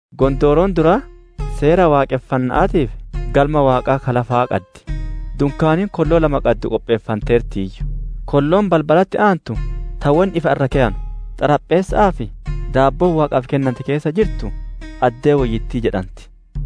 Gondooroon duraa seera waaqonfanna'aatii fi Galma Waaqaa ka lafaa qaddi. Dunkaaniin kolloo lama qaddu qopheeffanteertiiyyu. Kolloon balbalatti aantu ta wonni ifa irra keyanu, xarapheessa'aa fi daabboon Waaqa dura dhikaattu keessa jirtu, «Addee Woyyittii» jedhanti.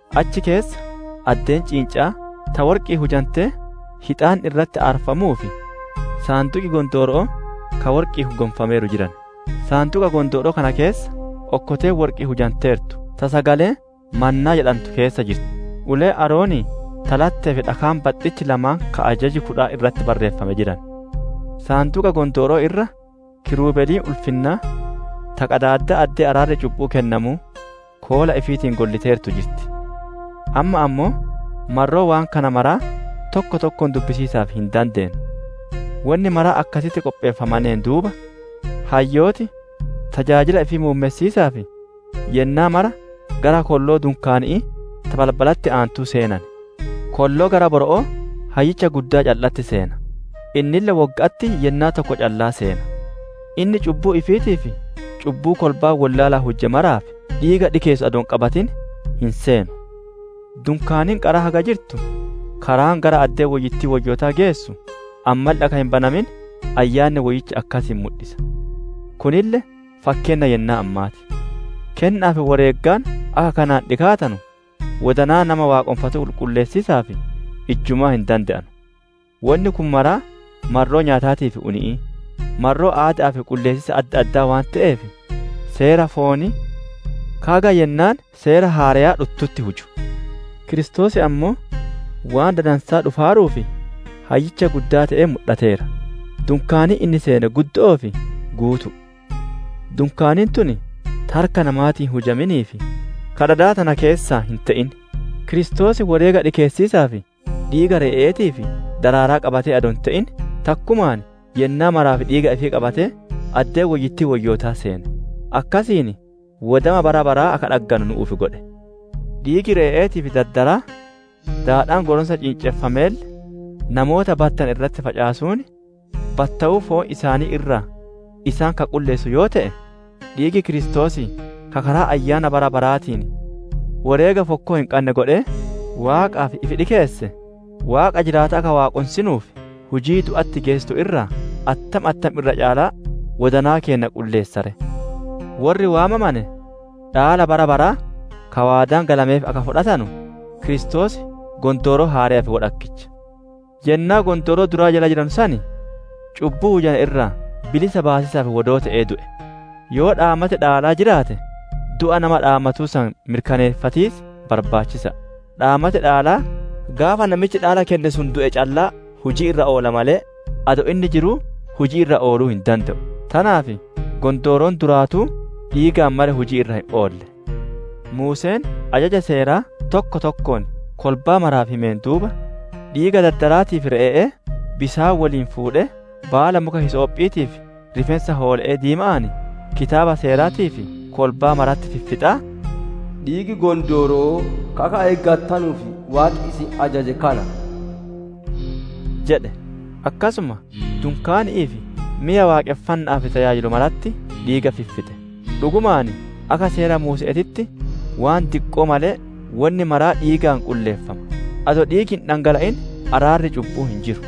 Achi keessa addeen ciinca'aa, ta worqi'iin hujantee hixaanni irratti aarfamuu fi Saanduqi Gondooro'oo ka worqi'iin gonfameeru jiran; Saanduqa Gondooro'oo tana keessa okkoteen worqi'iin hujanteertu ta sagaleen mannaa jedhantu keessa jirtu, uleen Aaronii ta lattee fi dhakaan baxxichi lamaan ka ajaji kudhan irratti barreeffame jiran. Saanduqa Gondooro'oo irra dadi ol-gubba'aa ta koola qaddu ta ulfinnaa, ta qadaaddaa addee araarri cubbu'uu kennamuu, koola ifiitiin golliteertu jirti; amma ammoo marroo waan kana maraa tokko tokkoon dubbatiisaaf hin dandeennu. Wonni mara akkasitti qopheeffameen duuba, hayyooti tajaajila ifii muummessiisaaf, yennaa mara gara kolloo dunkaani'ii ta balbalatti aantuu seenan. Kolloo gara boro'oo Hayyicha Guddaa calla'atti seena; innille wogga'atti yennaa tokko callaa seena; inni cubbuu ifiitii fi cubbuu kolbaan wollaalaan huje maraaf, dhiiga dhikeessu adoo hin qabatin hin seenu. Dunkaaniin qaraa haga jirtu karaan gara addee woyyittii woyyootaa geessu, ammalle akka hin banamin Ayyaanni Woyyichi akkasiin mudhisa. Kunille fakkeenna yennaa ammaa ti; kenna'aa fi woreegaan akka kanaan dhikaatanu wodanaa nama waaqonfatuu qulqulleessiisaaf ijjumaa hin dande'anu. Wonni kun mara marroo nyaataatii fi uni'ii, marroo aadaa ifi qulleessiisa adda addaa waan te'eef, seera foonii ka haga yennaan seera haareyaa dhuttutti huju. Kiristoos ammoo waan dadansaa dhufaaruuf Hayyicha Guddaa te'ee mudhateera; dunkaaniin inni seene guddo'oo fi guutu'u; dunkaaniin tun ta harka namaatiin hin hujaminii fi ta dada tana keessaa hin te'in. Kiristoos woreega dhikeessiisaaf dhiiga re'e'eetii fi dardaraa qabatee adoo hin te'in, takkumaan yennaa maraaf dhiiga ifii qabatee, addee woyyittii woyyoota seene; akkasiin wodama bara baraa akka dhagganu nu'uuf godhe. Dhiigii re'e'eetii fi dardaraa, daadhaan goronsa ciinceffameelle namoota battowane irratti facaasuun, battummaa foon isaanii irraa isaan ka qulleessu yoo te'e, dhiigi Kiristoosii ka karaa Ayyaana bara baraatiin, woreega fokkoo hin qanne godhee, Waaqaaf ifi dhikeesse, Waaqa jiraataa akka Waaqonsinuuf, hujii du'atti geessitu irraa attam attam irra caalaa wodanaa keenna qulleessa ree! Worri waamamane dhaala bara baraa ka waadaan galameef akka fudhatanu, Kiristoos Gondooroo Haareyaaf wodhakkicha. Yennaa Gondooroo duraa jala jiranu san cubbuu hujane irraa bilisa baasiisaaf wodoo te'ee du'e. Yoo dhaamati dhaalaa jiraate, du'a nama dhaamatuu san mirkaneeffatiis barbaachisa'a. Dhaamati dhaalaa gaafa namichi dhaala kenne sun du'e callaa hujii irra oola malee, adoo inni jiruu hujii irra ooluu hin dande'u. Tanaaf Gondooroon duraatuu dhiigaan malee hujii irra hin oolle. Muuseen ajaja Seeraa tokko tokkoon kolbaa maraaf himeen duuba, dhiiga dardaraatii fi re'e'ee bisaan woliin fuudhee, baala muka hisoophiitii fi rifeensa hoole'ee diima'aan, Kitaaba Seeraatii fi kolbaa maratti fiffixaa, «Dhiigi gondooro'oo ka akka eeggattanuuf Waaqi isin ajaje kana» jedhe. Akkasuma dunkaani'ii fi meya waaqonfanna'aaf tajaajilu maratti diiga fiffixe. Dhugumaan akka Seera Muuse'eetitti waan diqqoo malee, wonni maraa dhiigaan qulleeffama; adoo dhiigi hin dhangala'in araarri cubbu'uu hin jiru.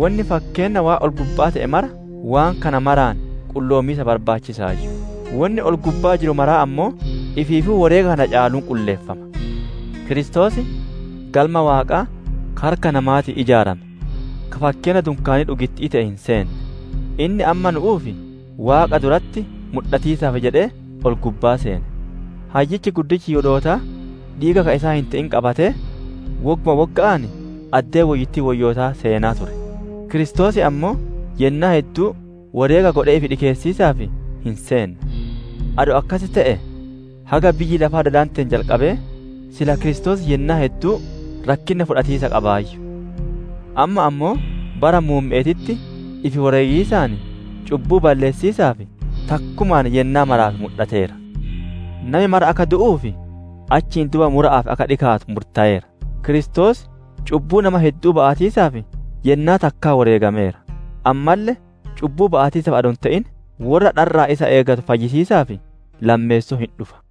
Wonni fakkeenna waan ol-gubba'aa te'e mara, waan kana maraan qulloomiis barbaachisa'aayyu; wonni ol-gubbaa jiru maraa ammoo ifiifuu woreega kana caaluun qulleeffama. Kiristoos Galma Waaqaa ka harka namaatiin ijaarame, ka fakkeenna dunkaanii dhugitti'ii te'e hin seenne; inni amma nu'uuf Waaqa duratti mudhatiisaaf jedhee ol-gubbaa seene. Hayyichi guddichi Yihudootaa dhiiga ka isaa hin te'in qabatee, wogguma wogga'aan addee woyyittii Woyyoota seenaa ture; Kiristoos ammoo yennaa hedduu woreega godhee ifi dhikeessiisaaf hin seenne. Adoo akkas te'ee, haga biyyi lafaa dadanteen jalqabee, sila Kiristoos yennaa hedduu rakkinna fudhatiisa qabaayyu. Amma ammoo bara muumme'eetitti, ifi woreegiisaan cubbuu balleessiisaaf, takkumaan yennaa maraaf mudhateera. Nami mara akka du'uu fi achiin duuba mura'aaf akka dhikaatu murtayeera. Kiristoos cubbuu nama heddu'uu ba'atiisaaf yennaa takkaa woreegameera; ammalle cubbuu ba'atiisaaf adoo hin te'in, worra dharra'aan isa eeggatu fayyisiisaaf lammeessoo hin dhufa.